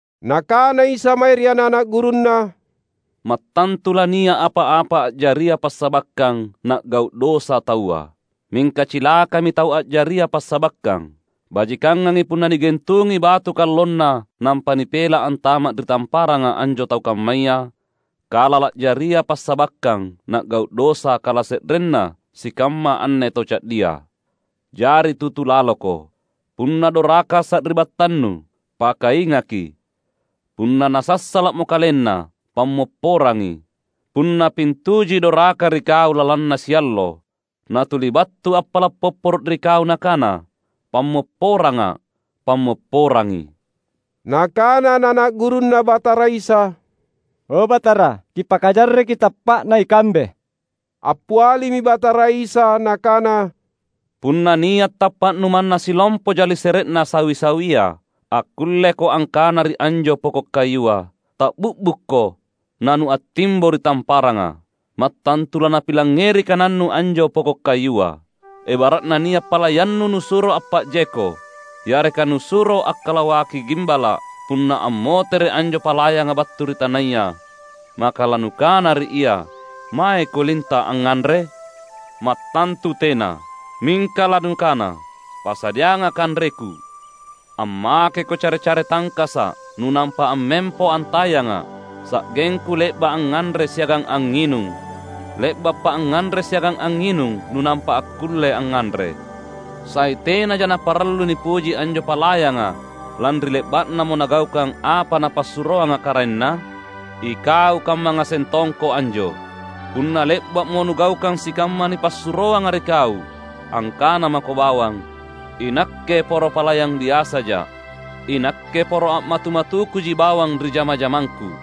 Nakana Isa mae ri ana’-ana’ gurunNa, "Mattantu lania’ apa-apa a’jaria passabakkang na’gau’ dosa taua. Mingka cilakami tau a’jaria passabakkang! Bajikangangi punna nigentungi batu kallonna nampa nipela’ antama’ ri tamparanga anjo tau kammaya, kala la’jaria passabakkang na’gau’ dosa kalase’renna sikamma anne tau ca’dia. Jari tutu laloko! Punna doraka sari’battannu, pakaingaki. Punna nasassala’mo kalenna, pammopporangi. Punna pintujui doraka ri kau lalanna siallo, natuli battu appala’ popporo’ ri kau nakana, ‘Pammopporanga’,’ pammopporangi." Nakana ana’-ana’ gurunNa Batara Isa, "O Batara, Kipakajarreki tappa’na ikambe." Appialimi Batara Isa Nakana, "Punna nia’ tappa’nu manna sillompoja lisere’na sawi-sawia, akkulleko angkana ri anjo poko’ kayua, ‘Ta’bi’bukko na nuattimbo ri tamparanga,’ mattantu lanapilangngeri kanannu anjo poko’ kayua." "Ebara’na nia’ palayannu nusuro appa’jeko, yareka nusuro akkalawaki gimbala’. Punna ammotere’ anjo palayanga battu ri tanaya, maka lanukana ri ia, ‘Maeko linta’ angnganre’? Mattantu tena! Mingka lanukana, ‘Pasadianga’ kanreku. Ammakeko care-care tangkasa’ nunampa ammempo antayanga’ sa’gengku le’ba’ angnganre siagang angnginung; le’bappa’ angnganre siagang angnginung nunampa akkulle angnganre.’ Sai tenaja naparallu nipuji anjo palayanga lanri le’ba’namo nagaukang apa napassuroanga karaenna? Ikau kamma ngaseng tongko anjo. Punna le’ba’mo nugaukang sikamma nipassuroanga ri kau, angkana mako bawang, ‘Inakke poro palayang biasaja’; inakke poro a’matu-matukuji bawang ri jama-jamangku.’"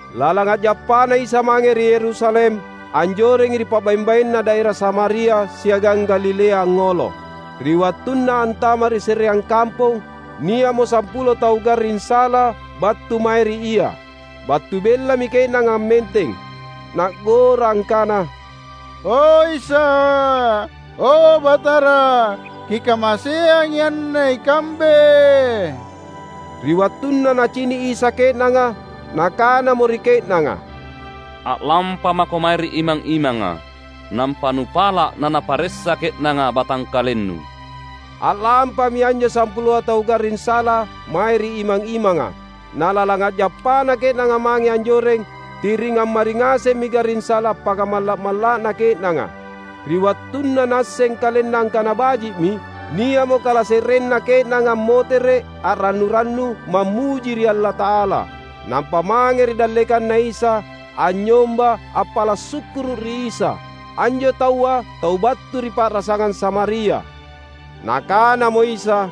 Lalang a’jappaNa Isa mange ri Yerusalem, anjorengi ri pa’baeng-baenna daera Samaria siagang Galilea angngolo. Ri wattunna antama’ ri se’reang kampong, nia’mo sampulo tau garring sala battu mae ri Ia. Battu bellami ke’nanga ammenteng na’gora angkana, "O, Isa! O, Batara! Kikamaseangi anne ikambe!" Ri wattunna Nacini’ Isa ke’nanga, Nakanamo ri ke’nanga, "A’lampamako mae ri imang-imanga, nampa nupala’ nanaparessa ke’nanga batangkalennu." A’lampami anjo sampuloa tau garring sala mae ri imang-imanga. Na lalang a’jappana ke’nanga mange anjoreng, ti’ring ammari ngasemmi garring sala appakamalla’-malla’na ke’nanga. Ri wattunna naasseng kalenna angkana baji’mi, nia’mo kalase’renna ke’nanga ammotere’ a’rannu-rannu mammuji ri Allata’ala. Nampa mange ri dallekanNa Isa, anynyomba appala’ sukkuru’ ri Isa. Anjo taua tau battu ri pa’rasangang Samaria. Nakanamo Isa,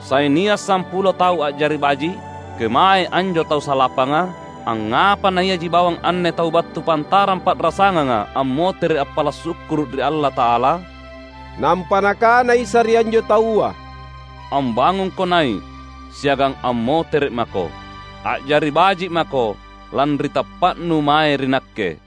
"Sai nia’ sampulo tau a’jari baji’? Kemaei anjo tau salapanga? Angngapa naiaji bawang anne tau battu pantarang pa’rasanganga ammotere’ appala’ sukkuru’ ri Allata’ala?" Nampa Nakana Isa ri anjo taua, "Ambangungko nai’ siagang ammotere’ mako. A’jari baji’ mako lanri tappa’nu mae ri Nakke."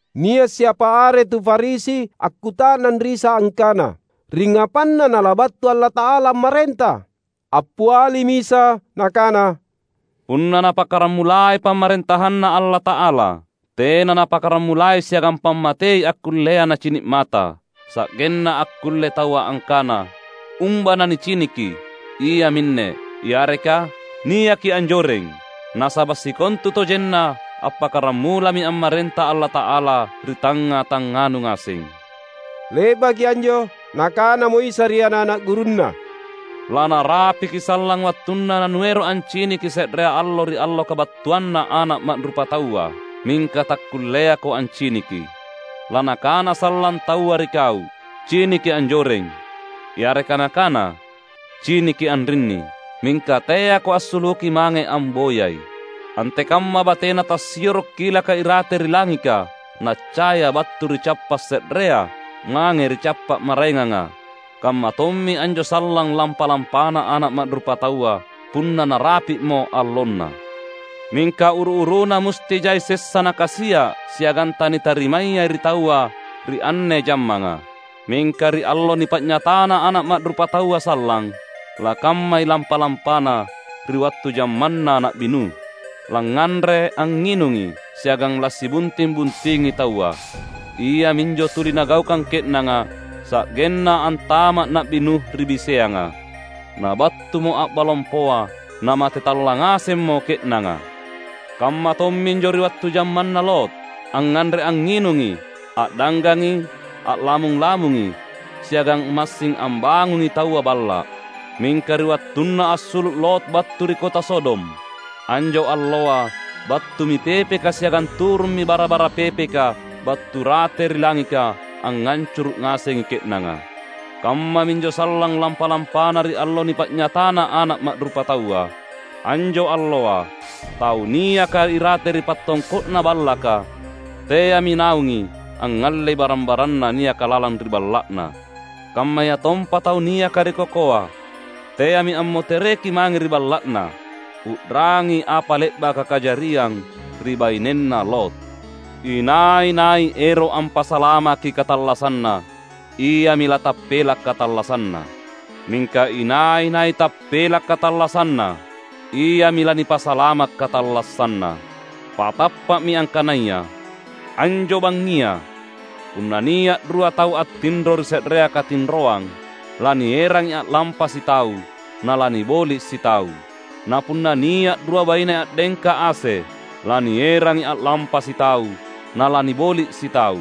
Nia’ siapa are tu Farisi akkuta’nang ri Isa angkana, ringngapanna Nalabattu Allata’ala ammarenta. Appialimi Isa Nakana, "Punna Napakkaramulai PamarentahanNa Allata’ala, tena Napakaramulai siagang pammatei akkullea nacini’ mata, sa’genna akkulle taua angkana, ‘Umba naniciniki, iaminne!’ yareka, ‘Niaki anjoreng!’ Nasaba’ sikontutojenna appakkaramulami ammarenta Allata’ala ri tangnga-tangnganu ngaseng." Le’baki anjo Nakanamo Isa ri ana’-ana’ gurunNa, "Lanarapiki sallang wattunna nanuero’ anciniki se’rea allo ri allo kabattuanNa Ana’ Ma’rupataua, mingka takkulleako anciniki. Lanakana sallang taua ri kau, ‘Ciniki, anjoreng!’ yareka nakana, ‘Ciniki, anrinni!’ Mingka teako assuluki mange amboyai. Antekamma batena tassioro’ kilaka irate ri langika naccaya battu ri cappa’ se’rea mange ri cappa’ maraenganga, kammatommi anjo sallang lampa-lampana Ana’ Ma’rupataua punna narapi’mo allonNa. Mingka uru-uruna musti jai sessa Nakasia’ siagang tanitarimayai ri taua ri anne jammanga. Mingka ri allo nipa’nyatana Ana’ Ma’rupataua sallang, lakammai lampa-lampana ri wattu jammanna Na’bi Nuh. Langnganre angnginungi, siagang lasibunting-buntingi taua; iaminjo tuli nagaukang ke’nanga, sa’genna antama’ Na’bi Nuh ri biseanga. Nabattumo a’ba lompoa, namate tallang ngasemmo ke’nanga. Kamma tomminjo ri wattu jammanna Lot. Angnganre angnginungi, a’danggangi, a’lamung-lamungi, siagang massing ambangungi taua balla’. Mingka ri wattunna assulu’ Lot battu ri kota Sodom, anjo alloa battumi pepeka siagang turummi bara-bara pepeka battu rate ri langika angngancuru’ ngasengi ke’nanga. Kammaminjo sallang lampa-lampana ri allo nipa’nyatana Ana’ Ma’rupataua. Anjo alloa, tau niaka irate ri pattongko’na ballaka teami naungi angngallei barang-baranna niaka lalang ri balla’na. Kammayatompa tau niaka ri kokoa teami ammotereki mange ri balla’na. U’rangi apa le’baka kajariang ri bainenna Lot! Inai-nai ero’ ampasalamaki katallassanna, iami latappela’ katallassanna. Mingka inai-nai tappela’ katallassanna, iami lanipasalama’ katallassanna. Patappa’mi angkanaya: anjo bangngia punna nia’ rua tau attinro ri se’rea katinroang, lanierangi a’lampa sitau, nalaniboli’ sitau. Na punna nia’ rua baine a’dengka ase, lanierangi a’lampa sitau, nalaniboli’ sitau.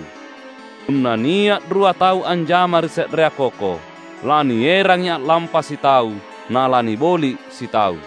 [Punna nia' rua tau anjama ri se'rea koko, lanierangi a'lampa sitau, nalaniboli' sitau.]"